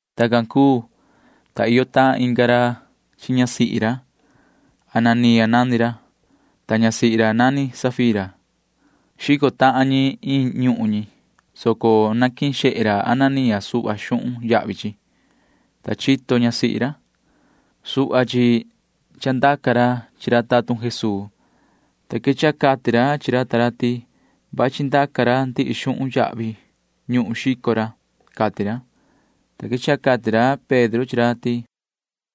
Tacan cuu, ta iyo tahan inga ra chi ñasihi ra. Ananía nani ra, ta ñasihi ra nani Safira. Xico tahan ñi iin ñuhun ñi, soco naquihin xehe ra Ananía suhva xuhun yahvi chi, ta chito ñasihi ra. Suhva chi chandaca ra chi ra tatun Jesuu, ta quechaha cati ra chi ra ta ra ti vachi ndaca ra ndihi xuhun yahvi ñuhun xico ra, cati ra, ta quechaha cati ra Pedro chi ra ti: ―Yoho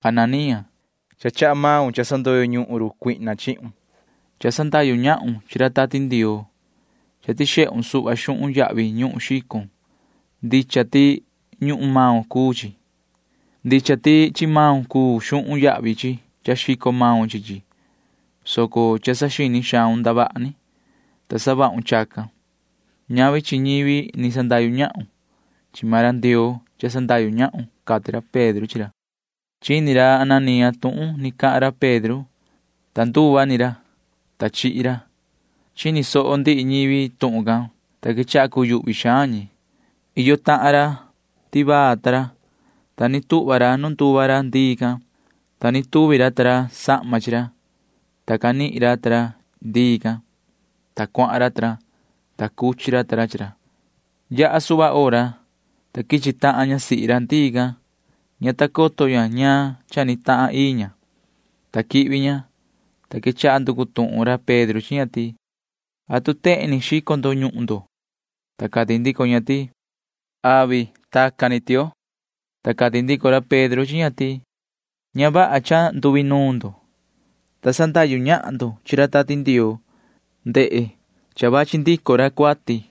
Ananía, cha chaha maun cha sandoyo ñuhun run Satanaa chihun. Cha sandahyu ñahun chi ra Tati Ndioo. Cha tixehun suhva xuhun yahvi ñuhun xicon. Ndicha ti ñuhun maun cuu chi. Ndicha ti chi maun cuu xuhun yahvi chi cha xico maun chi chi, soco cha saxini xaun ndavaha ni, ta savahun chacan. Ñavi chi ñivi ni sandahyu ñahun. Chi maan ra Ndioo cha sandahyu ñahun ―cati ra Pedro chi ra. Chini ni ra Ananía tuhun ni cahan ra Pedro, ta nduva ni ra, ta chihi ra. Chini soho ndihi ñivi tuhun can, ta quechaha cuyuhvi xaan ñi. Iyo tahan ra tivaa ta ra, ta ni tuhva ra nu nduva ra ndii can, ta ni tuvi ra ta ra sahma chi ra, ta canihin ra ta ra chi ndii can, ta cuahan ra ta ra, ta cuchi ra ta ra chi ra. Yaha suhva hora, ta quichi tahan ñasihi ra ndii can. Ña ta coto ña ñaan cha ni tahan ii ña, ta quihvi ña, ta quechaha nducu tuhun ra Pedro chi ña ti: ―¿Atu tehen ni xico ndo ñuhun ndo? Ta cati ndico ña ti: ―Avi. Tacan ni, tioo. Ta cati ndico ra Pedro chi ña ti: ―Ña vaha cha nduinuun ndo, ta sandahyu ñahan ndo chi ra Tati Ndioo. Ndehe. Cha vachi ndico ra cuati,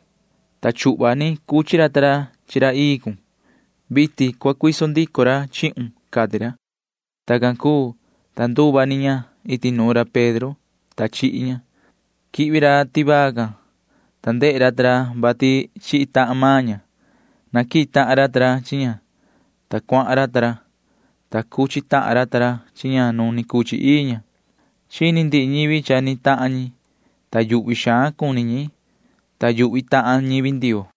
ta chuhva ni cuchi ra ta ra chi ra ii cun. Vitin cua cuiso ndico ra chihun ―cati ra. Tacan cuu, ta nduva ni ña iti nuun ra Pedro, ta chihi ña. Quihvi ra tivaa can, ta ndehe ra ta ra vati chihi tahan maan ña. Naquihin tahan ra ta ra chi ña, ta cuahan ra ta ra, ta cuchi tahan ra ta ra chi ña nu ni cuchi ii ña. Chini ndihi ñivi cha ni tahan ñi, ta yuhvi xaan cuni ñi, ta yuhvi tahan ñivi Ndioo.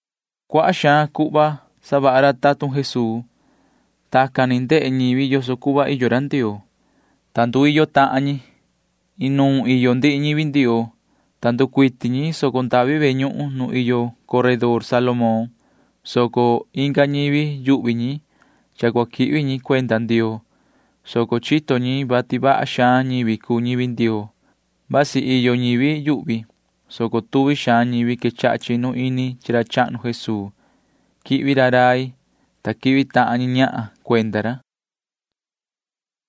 Cuaha xaan cuhva savaha ra tatun Jesuu. Tacan ni ndehe ñivi yoso cuhva iyo ra Ndioo, ta nduiyo tahan ñi. Inuun iyo ndihi ñivi Ndioo, ta nducuiti ñi soco ndavi ve ñuhun cahnu nu iyo coredor Salomón, soco inga ñivi yuhvi ñi cha cua quihvi ñi cuenda Ndioo, soco chito ñi vati vaha xaan ñivi cuu ñivi Ndioo. Vasi iyo ñivi yuhvi, soco tuvi xaan ñivi quechaha chinu ini chi ra chahnu Jesuu. Quihvi ra rai, ta quihvi tahan ñi ñahan cuenda ra.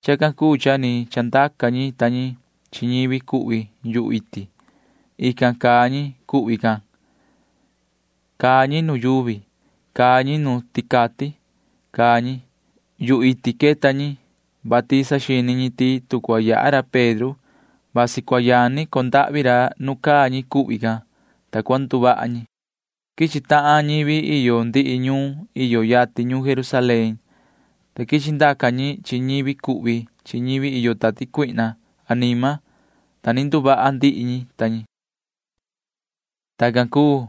Chacan cuu cha ni chandaca ñi ta ñi chi ñivi cuhvi yuhu iti. Ican caa ñi cuhvi can. Caa ñi nu yuvi. Caa ñi nu ticati. Caa ñi. Yuhu iti queta ñi, vati saxini ñi ti tu cua yaha ra Pedro, vasi cua yani condahvi ra nu caa ñi cuhvi can, ta cua nduvaha ñi. Quichi tahan ñivi iyo ndihi ñuun iyo yatin ñuun Jerusalén, ta quichi ndaca ñi chi ñivi cuhvi chi ñivi iyo tati cuihna anima, ta ni nduvaha ndihi ñi ta ñi. Tacan cuu,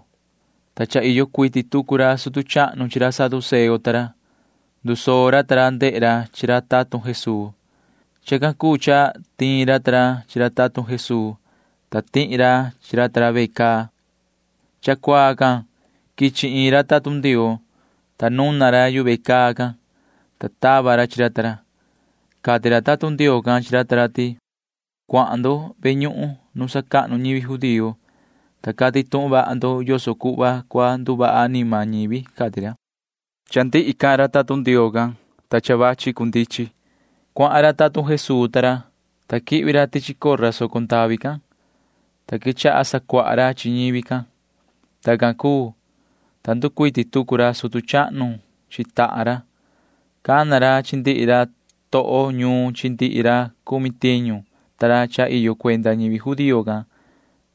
ta cha iyo cuiti tucu ra sutu chahnu chi ra saduceo ta ra. Ndusoo ra ta ra ndehe ra chi ra tatun Jesuu. Chacan cuu cha tiin ra ta ra chi ra tatun Jesuu, ta tihi ra chi ra ta ra ve caa. Cha cuaa can quichi iin ra tatun Ndioo, ta nuna ra yu ve caa can, ta tava ra chi ra ta ra. Cati ra tatun Ndioo can chi ra ta ra ti: ―Cuahan ndo ve ñuhun cahnu nu sacahnu ñivi judío, ta cati tuhun vaha ndo yoso cuhva cua nduvaha anima ñivi ―cati ra. Cha ndihi cahan ra tatun Ndioo can, ta vachi cundichin. Cuahan ra tatun Jesuu ta ra, ta quihvi ra tichi cora soco ndavi can, ta quechaha sacuaha ra chi ñivi can. Tacan cuu, ta nducuiti tucu ra sutu chahnu chi tahan ra. Cana ra chi ndihi ra toho ñuun chi ndihi ra cumi tiñu ta ra cha iyo cuenda ñivi judío can,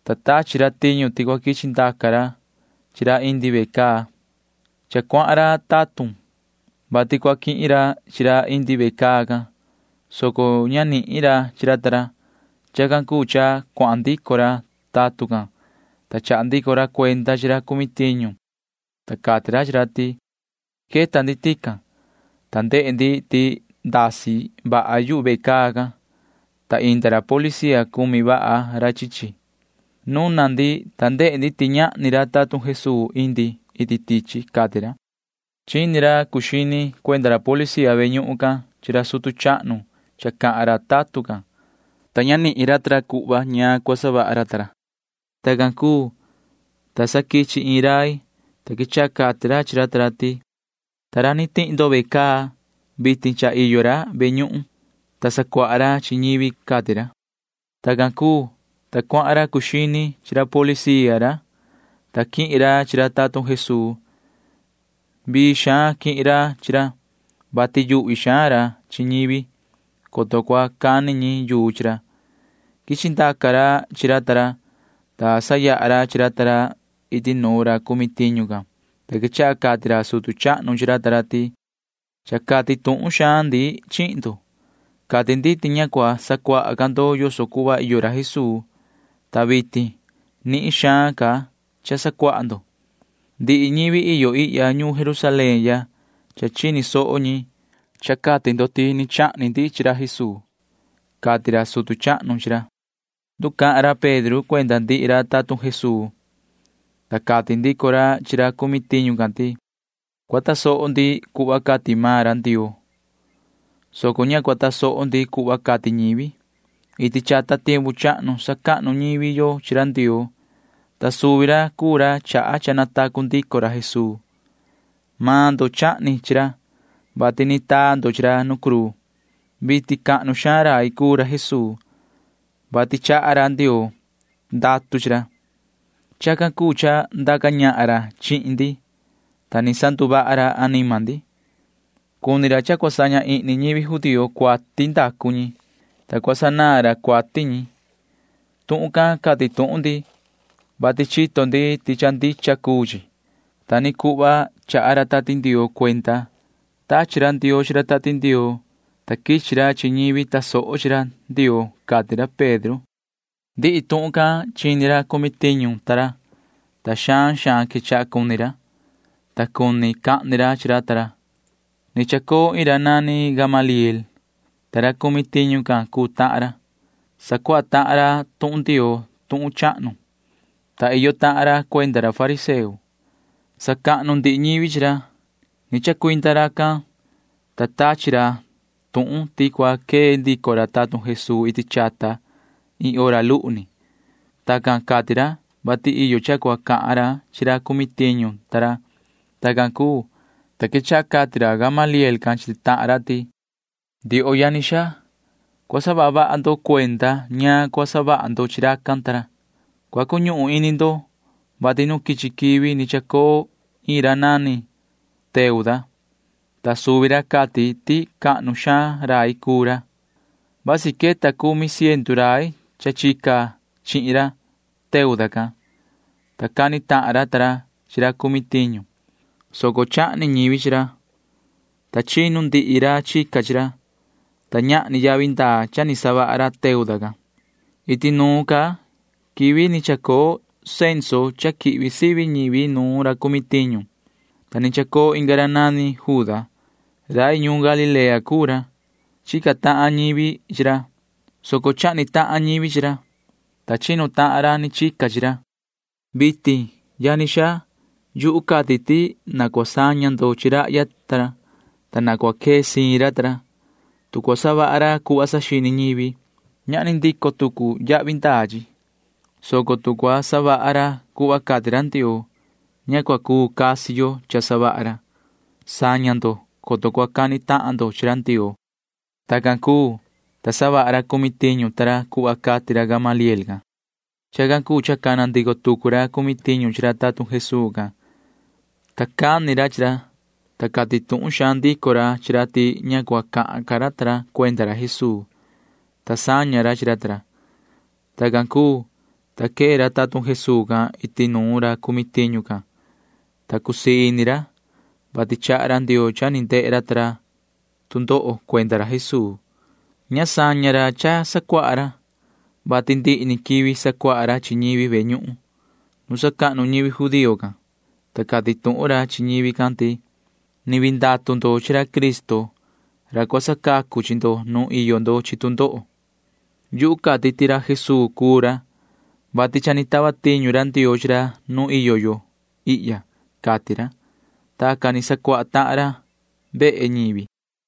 ta tachi ra tiñu ti cua quichi ndaca ra chi ra indi ve caa. Cha cuahan ra tatun, vati cua quihin ra chi ra indi ve caa can, soco ña nihin ra chi ra ta ra. Chacan cuu cha cuahan ndico ra tatun can, ta chaha ndico ra cuenda chi ra cumi tiñu, ta cati ra chi ra ti: ―Queta ndi tican, ta ndehe ndi ti ndasi vaha yu ve caa can, ta inda ra policía cumi vaha ra chi chi. Nuna ndi, ta ndehe ndi ti ñahni ra tatun Jesuu indi iti tichi ―cati ra. Chini ra cuu xini cuenda ra policía ve ñuhun cahnu can chi ra sutu chahnu cha cahan ra tatun can, ta ña nihin ra ta ra cuhva ñaan cua savaha ra. Tacan cuu, ta sa quichi iin rai, ta quechaha cati ra chi ra ta ra ti: ―Ta ra ni tihi ndo ve caa, vitin cha iyo ra ve ñuhun cahnu, ta sacuaha ra chi ñivi ―cati ra. Tacan cuu, ta cuahan ra cuu xini chi ra policía ra, ta quihin ra chi ra tatun Jesuu. Vii xaan quihin ra chi ra, vati yuhvi xaan ra chi ñivi, coto cua cani ñi yuu chi ra. Quichi ndaca ra chi ra ta ra, ta sayaha ra chi ra ta ra iti nu ra cumi tiñu can, ta quechaha cati ra sutu chahnu chi ra ta ra ti: ―Cha cati tuhun xaan ndi chihin ndo. Cati ndi ti ña cua sacuaha ca ndo yoso cuhva iyo ra Jesuu, ta vitin nihin xaan ca cha sacuaha ndo. Ndihi ñivi iyo ihya ñuun Jerusalén ya cha chini soho ñi, ta cati ndo ti chahni ndi chi ra Jesuu ―cati ra sutu chahnu chi ra. Nducahan ra Pedro cuenda ndihi ra tatun Jesuu, ta cati ndico ra chi ra cumi tiñu can ti: ―Cua tasoho ndi cuhva cati maan ra Ndioo, soco ña cua tasoho ndi cuhva cati ñivi. Iti chata tiempu chahnu sacahnu ñivi yo chi ra Ndioo, ta suvi ra cuu ra chaha cha natacu ndico ra Jesuu. Maan ndo chahni chi ra, vati ni taa ndo chi ra nu cruu. Vitin cahnu xaan rai cuu ra Jesuu, vati chaha Ndioo ndatu chi ra. Chacan cuu cha ndaca ñahan ra chihin ndi, ta ni sanduvaha ra anima ndi. Cuni ra cha cua saña ihni ñivi judío cuati ndacu ñi, ta cua sanaan ra cuati ñi. Tuhun can cati tuhun ndi, vati chito ndi ti cha ndicha cuu chi. Ta ni cuhva chaha ra Tati Ndioo cuenda. Tachi ra Ndioo chi ra Tati Ndioo, ta quichi ra chi ñivi tasoho chi ra Ndioo ―cati ra Pedro ta ra. Ndihi tuhun can chini ra cumi tiñu ta ra, ta xaan xaan quechaha cuni ra, ta cuni cahni ra chi ra ta ra. Ni chacoo iin ra nani Gamaliel, ta ra cumi tiñu can cuu tahan ra. Sacuaha tahan ra tuhun Ndioo tuhun chahnu, ta iyo tahan ra cuenda ra fariseo. Sacahnu ndihi ñivi chi ra. Ni chacuinda racan, ta tachi ra tuhun ti cua quee ndico ra tatun Jesuu iti chata iin hora luhu ni. Tacan cati ra, vati iyo cha cua cahan ra chi ra cumi tiñu ta ra. Tacan cuu, ta quechaha cati ra Gamaliel can chi tahan ra ti: ―Ndioho yani xaa, cua saha vaha ndo cuenda ñaan cua savaha ndo chi racan ta ra. Cua cuñuhun ini ndo, vati nu quichi quivi ni chacoo iin ra nani Teuda, ta suvi ra cati ti cahnu xaan rai cuu ra. Vasi queta cumi ciendu rai cha chica chihin ra Teuda can, ta cani tahan ra ta ra chi ra cumi tiñu, soco chahni ñivi chi ra, ta chinu ndihi ra chica chi ra, ta ñahni yavi ndaa cha ni savaha ra Teuda can. Iti nuun ca quivi ni chacoo censo cha quihvi sivi ñivi nuun ra cumi tiñu, ta ni chacoo inga ra nani Juda. Rai ñuun Galilea cuu ra. Chica tahan ñivi chi ra, soco chahni tahan ñivi chi ra, ta chinu tahan ra ni chica chi ra. Vitin, yani xaa, yuhu cati ti na cua saña ndo chi rahya ta ra, ta na cua quee siin ra ta ra. Tu cua savaha ra cuhva saxini ñivi, ñahni ndico tucu yavi ndaa chi, soco tu cua savaha ra cuhva cati ra Ndioo, ña cua cuu casi yo cha savaha ra. Saña ndo, coto cua cani tahan ndo chi ra Ndioo ―cati ra Gamaliel chi ra ta ra. Tacan cuu, ta savaha ra cumi tiñu ta ra cuhva cati ra Gamaliel can. Chacan cuu cha cana ndico tucu ra cumi tiñu chi ra tatun Jesuu can, ta cani ra chi ra, ta cati tuhun xaan ndico ra chi ra ti ña cua cahan ca ra ta ra cuenda ra Jesuu, ta saña ra chi ra ta ra. Tacan cuu, ta quee ra tatun Jesuu can iti nuun ra cumi tiñu can, ta cusii ini ra, vati chaha ra Ndioo cha ni ndehe ra ta ra tu ndoho cuenda ra Jesuu. Ña saña ra cha sacuaha ra, vati ndihi ni quivi sacuaha ra chi ñivi ve ñuhun cahnu nu sacahnu ñivi judío can, ta cati tuhun ra chi ñivi can ti: ―Ni vii ndatu ndo chi ra Cristo ra cua sacacu chi ndo nu iyo ndo chi tu ndoho. Yuhu cati ti ra Jesuu cuu ra, vati cha ni tava tiñu ra Ndioo chi ra nu iyo yo ihya ―cati ra. Tacan ni sacuaha tahan ra vehe ñivi.